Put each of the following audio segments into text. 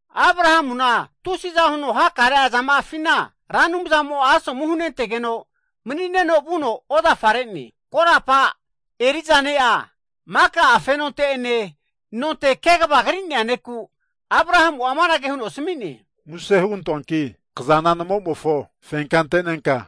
Abrahamuna tusiza huno hakare'a zama'afi Ra Anumzamo asomu hunentegeno mani'neno ozafare'ne. Korapa eri'za ne'a, maka'a fenonte ene nonte kegva gri'nea ne'ku, Abrahamu amanage huno asmi'ne, Muse (plis) hugantoanki kzana namo'mofo fenka anto.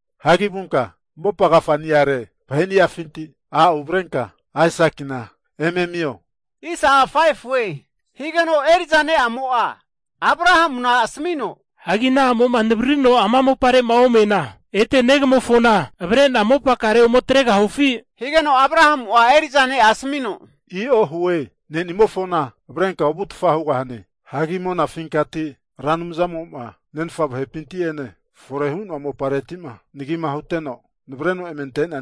Hagi vunka mopa agafa'niare vahe'niafinti a' uvrenka Aisakina eme amio. Eri'za ne'amo Abrahamu asmi'ne, Hanki ana a'mo navririno'ma ama mopare omena, ete negamofona avre'na mopakare ome atregahufi? Anante Abrahamu'a eri'za ne'a asmi'ne, I'o hue! ne'nimofona avrenka ovutfa hugahane. Monafinka Ra Anumzamo nemni'a Anumzamo nenfa vahe'pinti ene fore hu'noa mopareti, navreno emenanteno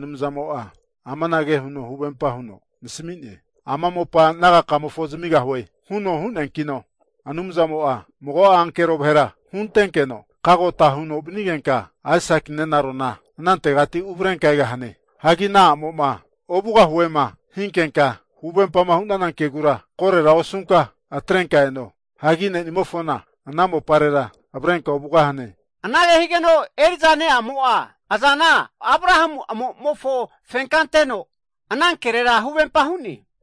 amanage huno huvempa huno nasmi'ne, ama mopa nagakamofo zamigahue, huno hu'neankino Anumzamo mago ankero vahera huntenkeno kagota hugantenkenka, Aisaki nenaro anantegati uvrenka egahane. Hagi ana a'mo, ovugahuema hinkenka huvempama hu'nana kegu koro osunka atrenka eno. Hagi ne'nimofona ana mopare avrenka ovugahane. Anage higeno, eri'za ne'amo azana Abrahamu amo'mofo fenka anteno, anankere huvempa hu'ne.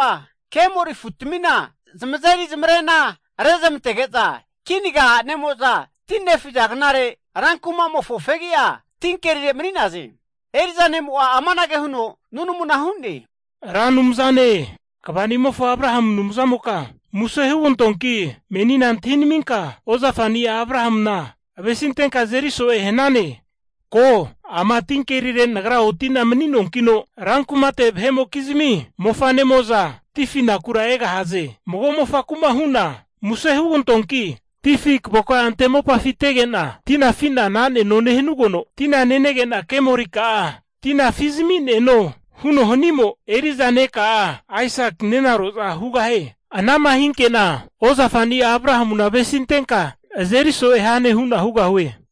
Kemori afu'tmina zamazeri rena rezmantege'za, tinkerire a'nemo'za ti nefiza knare kinaga rankuma'mofo fegi'a mani'naze. Eri'za ne'mo amanage huno nunamu hu'ne, Ra Anumzane, ozafani'amofo Abrahamu Anumza'moka muse (plis) hugantoanki, menina antahi nminka, ozafani'a Abrahamuna avesintenka azeri so'e hnane. Keho, ti hnatite nagra otina mani'nanena, rankumate vahe'mokizmi mofanemo'za ti afinakura egahaze. Mago mofaku'ma hu'na, Muse (plis) hugantoanki, ti afi kavo ante mopafitege'na afi'na na'neno nehnugeno, tina nenege'na kemorika'a afi zami'neno, huno hanimo eri'za neka'a Aisaki nenaroza hugahie. Anama hinke'na, Abrahamu ozafani'a avesintenka azeri so'e hane hugahue.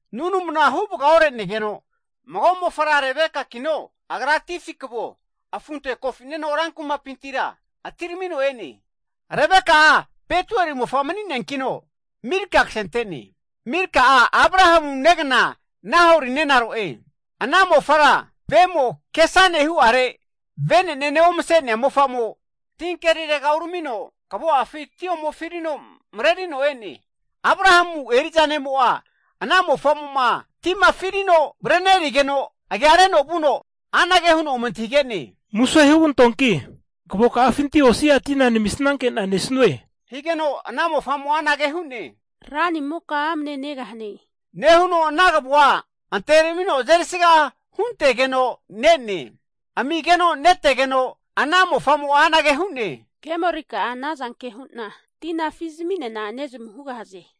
Nunmuna huvga ore'neno, keana mago mofara Rebeka agra ti afi kvo afunte kofino atirmino e'ne. Milka nemofo Betuel ksente'nea mofa, (Milka'a, Abrahamu negna Nahori nenaro'e), Ana mofara vemo ke asane hu'are, vene'nene omse'nea mofamo, tintega uramino kvo'afi ti omefirino mrerino e'ne. Abrahamu eri'za ne'mo, ana mofa'mo ti afirino mrerige'no agia reno ome antahige'ne ana mofara, Muse hugantoanki kvoka'afinti osi'a tina nmisanke'na nesue. Ana mofa'mo hu'ne, ranimoka amne negahane nehuno ana kvo'a anteme ramino azeri sga huntegeno ne'ne. Amigeno netegeno, ana mofa'mo asmi'ne, Kemorika'a ana zanke hu'na tina afi zami'nena nezmu hugahaze,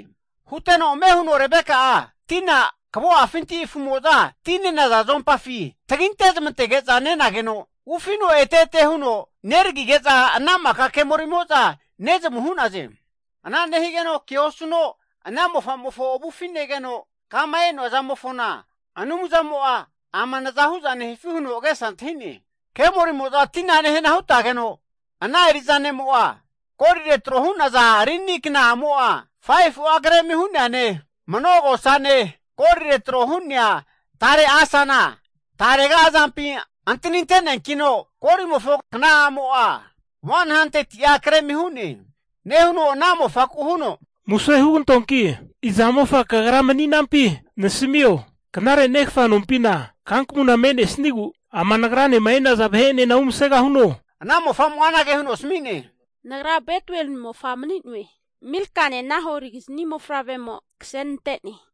Huteno ame huno tina kvo'finti afu'moza ti nenaza zompafi taginte zamantege'za nenageno, ufino ete ete huno neragige'za ana maka kemorimo'za nevgare'naze. Ana nehigeno ke osu'no ana mofa'mofo avufi negeno mani'ne, Kama ante'na e'nomofona, Anumzamo'a naza nehifi nosie huno eri'za ne'mo agesa antahi'ne. Kemorimo'za ti nehana hutageno, ana eri'za ne'mo golire tro hu'naza rini kna'amo 5fu'a gremi hu'neane manogosane, golire tro hu'nea asana tarega azampi antaninte'ne, korimofo kna'amo 100ti'a grem hu'ne, nehuno ana mofaku hu'ne, Iza mofa kagra mani'nane? Muse (plis) hugantoanki nasmio, knare negfa nompina kankmuna me'nesigu umasegahuno? Ana mofa'mo asmi'ne, Nagra Betuel mofa mani'noe Milkane, Nahorigizni mofavremo ksenante'ne.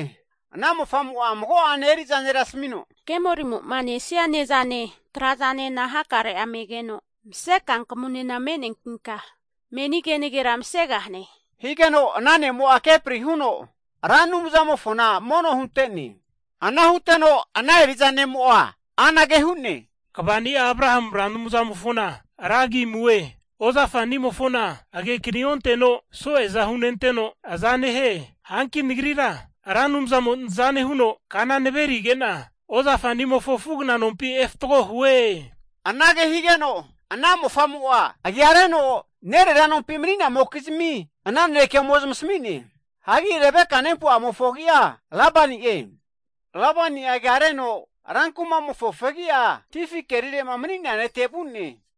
Ana mofa'mo mago'ene eri'za ne' asmi'ne, Kemorimo nesia ne'zana hakare'a me'ne, hanki mse kankmunena me'ne. Anante ana ne'mo kepri huno, Ra Anumza'mofo mono hunte'ne. Eri'za ne'mo hu'ne, Rankagi kamue, ozafani'a Abrahamu Ra Anumzamoka, agekani onteno soe'za hunenteno aza nehie ozafa'nimofona, hanki nagrira Ra Anumzamo nza nehuno kana nverige'na ozafa'nimofo afu'agna nompi efatgo hue. Ana mofa'mo agia reno nerera nompi mani'namokizmi ana naneke ome zamasmi'ne. Hagi Rebeka nempu'amofo agi'a Labani'e, Labani agia reno fegi'a vuno ti fi kerire mani'nea nete vu'ne.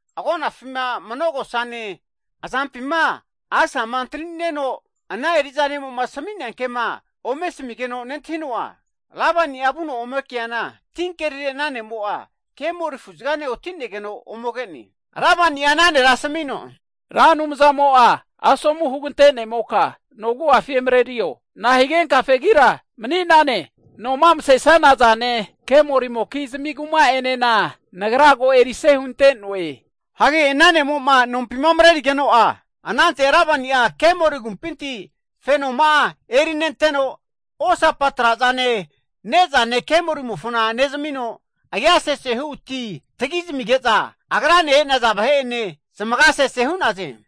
Agonafi manogosa renenteno, asama azampi nesaro antani'nea negeno, nesaro Rebeka ana eri'za ne'mo asmia ke nentahino, ana netega vuno, ome keana tinkerire kemori afu'zgane otinegeno ke'ne. Labani ana ne' asmi'ne, Ra Anumzamo asomu hugantene'moka no agu'afi emrerio. Nahigenka fegira mani'nane, no msesanazane kamorimokizmi kuma'enena nagra ko erise hunte'noe. Ana ne'mo nompi mrerige'no, anante Labani'a kemori agumpinti fenoma'a erinenteno, Kemori mofo osapa trazane, ne'zane nezmino, agia sesehu ti tagi zamige'za agrane e'naza vahe'ene zamaga sese hu'naze.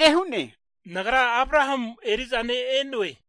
Agra anage hu'ne, nagra Abrahamu eri'za ne'a e'noe.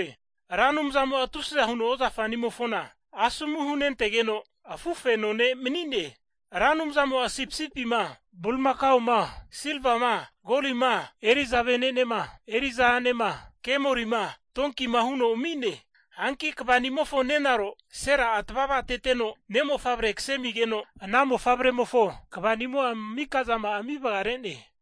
Ra Anumzamo tusiza huno ozafa'nimofona asomu hunentege'no afufeno ne' mani'ne, Ramo sipisipima, bulimaka'ma, silvafi, korifi, eri'za vahe'ma, a'nema, kemorima, donkima huno ami'ne. Hanki ozafanimofo nenaro Sera'a tavavateteno ne'mofavre kase amigeno, ana mofavremofo mika zama'a ami vgare'ne.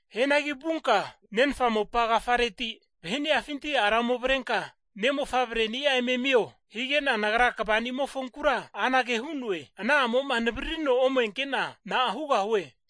Hianagi vunka nenfa mopa agafareti, vahe'niafinti ara ome avrenka ne' mofavreni'a eme amio. Nagra ozafanimofonku anage hu'noe, Ana a'moma navaririno omenke'na na'a hugahu'e?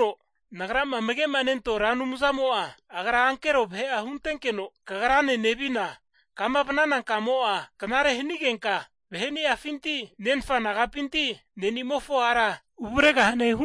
Nagrama amage' nentoa Ra Anumzamo, Agra ankero vahe'a huntenkeno kagrane nevina kama vnana kamo'a knare hanigenka, vahe'niafinti nenfa nompinti ne'nimofo a'ra uvregahane.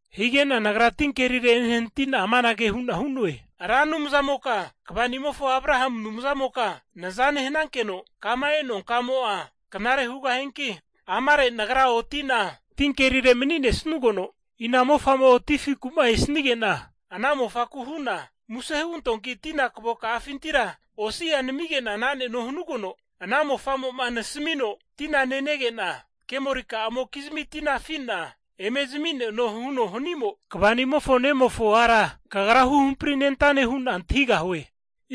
Hige'na nagra meni ti afite enehnati'na amanage hu'na hu'noe, Ra Anumzamoka ozafa'nimofo Abrahamu Anumzana, nza nehnankeno kama eno'a kamo'a knare hnie, amare nagra otina tinte mani'nesugeno, ina mofamo'o ti afiku'ma esanige'na ana mofaku hu'na, Muse (plis) hugantoanki tina kavoka'afintira osi'a namige'na na'neno hanugeno, ana mofamo nasmino, Tina nenege'na kemorikamokizmi tina afi'na eme zami'neno huno hanimo, ozafa'nimofo ne'amofo ara Ra Anumzamo hampri nente hu'na antahigahue.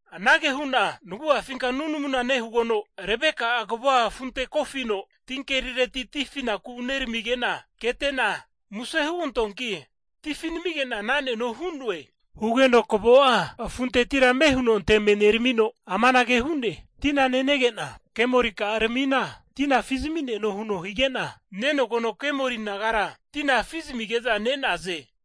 Anage hu'na nagu'afinka nunamuna nehugeno, Rebeka kvo afunte kofino tinkerireti ti afinaku uramigena kete'na, Muse (plis) hugantoanki ti afi namige'na na'neno hu'noe. Kavo'a afunteti ame huno anteme neramino amanage hu'ne, Tina erinka nenege'na, Kemorika'a tina afi zamineno huno hige'na, nenogeno kemori naga ti afino zamige'za ne'naze.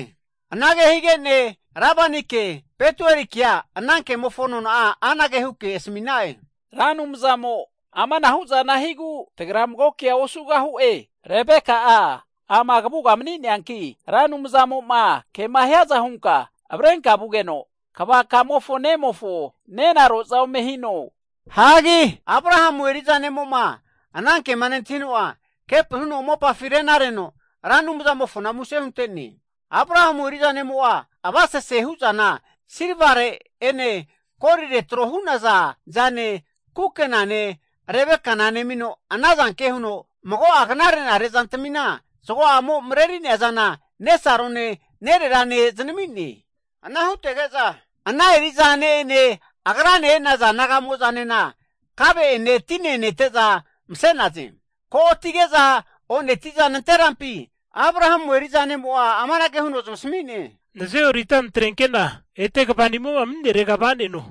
Anage hige'ne Labanike, Betuelike ana kemofo nona'a asmina'e, Ra Anumzamo amanahu'zana higu, tagra mago'a havigeo tamageo osugahu'e hu'na'e. Rebeka ama kavuga mani'neanki, Ra Anumzamo ke hiaza hunka avrenka vugeno, ozafa kamofo ne'mofo nenaro'za hino. Abrahamu eri'za ne'mo nentahino, kepri huno mopafi rena reno Ra Anumzamofo muse hunte'ne. Abrahamu eri'za ne'mo avasese hu'zana silvare'ene, golire tro hu'naza zane, kukenane Rebeka nemino, anazanke huno mago'a knare'nare zantmina zgo'amo mreri'nea zana nesarone, nererane znami'ne. Zamiteno ana eri'za ne'ene agrane e'naza naga ene kave'ene tinena nete'za mase'naze. Ko'atige'za o'neti'za nanterampi amanage huno zamasmi'ne, Hunantenke'na ozafa'nimo nehirega va'neno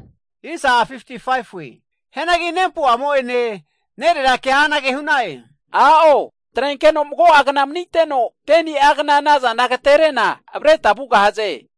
hu'ne. Hianagi, nempu'amo'ene nerera'kea anage hu'na'e, A'o atrenkeno mago'agna maniteno, 10ni'agna azana agaterete'na, avre tma vugahaze.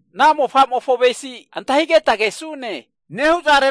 ana mofa'mofo avesi antahigeta kesu'e nehu'ne,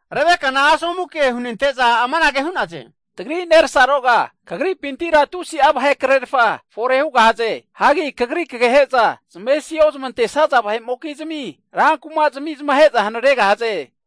Rebekana asomu ke hunente'za amanage hu'naze, Kagra, tagri nersaroga, Kagripinti tusi'a vahe krerfa fore hugahaze. Hagi kagri kagehe'za zamesi ozmantesaza vahe'mokizmi rankumazmi zamahe'za hanregahaze.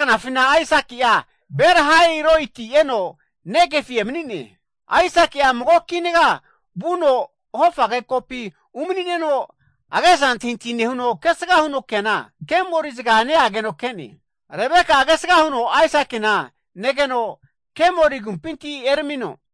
Aisaki'a Ber-lahai-roiti eno, Negev agra emani'ne. Aisaki'a mago kinaga vuno hofage kopi umani'neno agesa antahi antahi nehuno kesga huno keana, kemori'zga neageno ke'ne. Rebeka'a kesga huno Aisakina negeno kemori agumpinti erami'ne.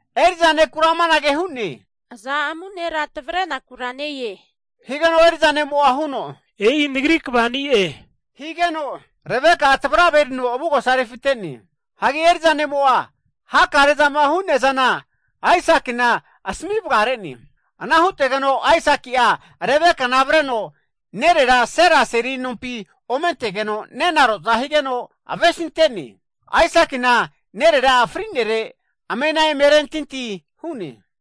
Eri'za ne'ku amanage hu'ne, aza amanu nera tavrenakura ne-e? Higeno eri'za ne'mo huno e'i nagri ozafe higeno. Anante Rebeka tavrave erino avugosa refite'ne. Eri'za nemo Aisakina hakare zama hu'nea zana asmi vare'ne. Ana hutegeno Aisaki'a Rebekana avreno nerera Sera seri nompi ome antegeno nenaroza higeno, avesintene. Aisakina nerera'a fri'nere amena eme arentinti hu'ne.